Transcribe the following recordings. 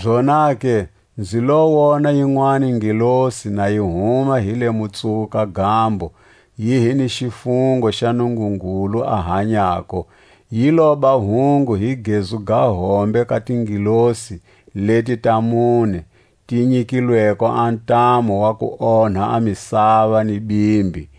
Zonake nzi lo wona yinwani ngelosi na yi huma hi le Mutsuwuka-gambo, yi hi ni xifungo xa Nungungulu a hanyako. Yi loba hungu hi gezu ga hombe ka tingelosi leti ta mune ti nyikilweko a ntamu wa ku onha a misava ni bimbi,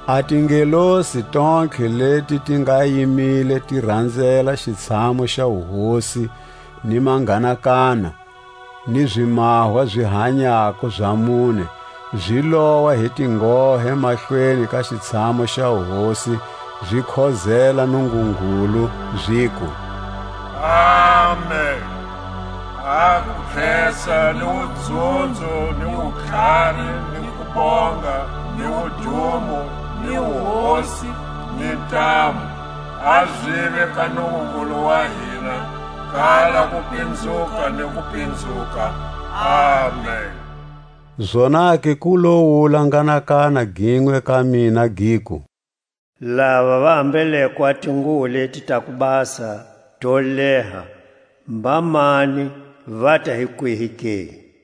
A tingelosi tontlhe leti ti nga yimile ti ranzela xitshamu xa wuhosi, ni manghanakana, ni zimahwa zi hanyako za mune, zi lowa hi tinghohe mahlweni ka xitshamu xa wuhosi, zi khozela Nungungulu, ziku: Amen! A kukhesa, ni wudzunzo, ni wutlhari, ni kubonga, ni wudumo, ni wuhosi, ni ntamu, a zive ka Nungungulu wa hina kala kupinzuka ni kupinzuka. Amen. Zonake ku lo wula nghanakana ginwe ka mina, giku: Lava va ambeleko a tinguwo leti ta kubasa to leha mbamani, vata hi kwihi ke?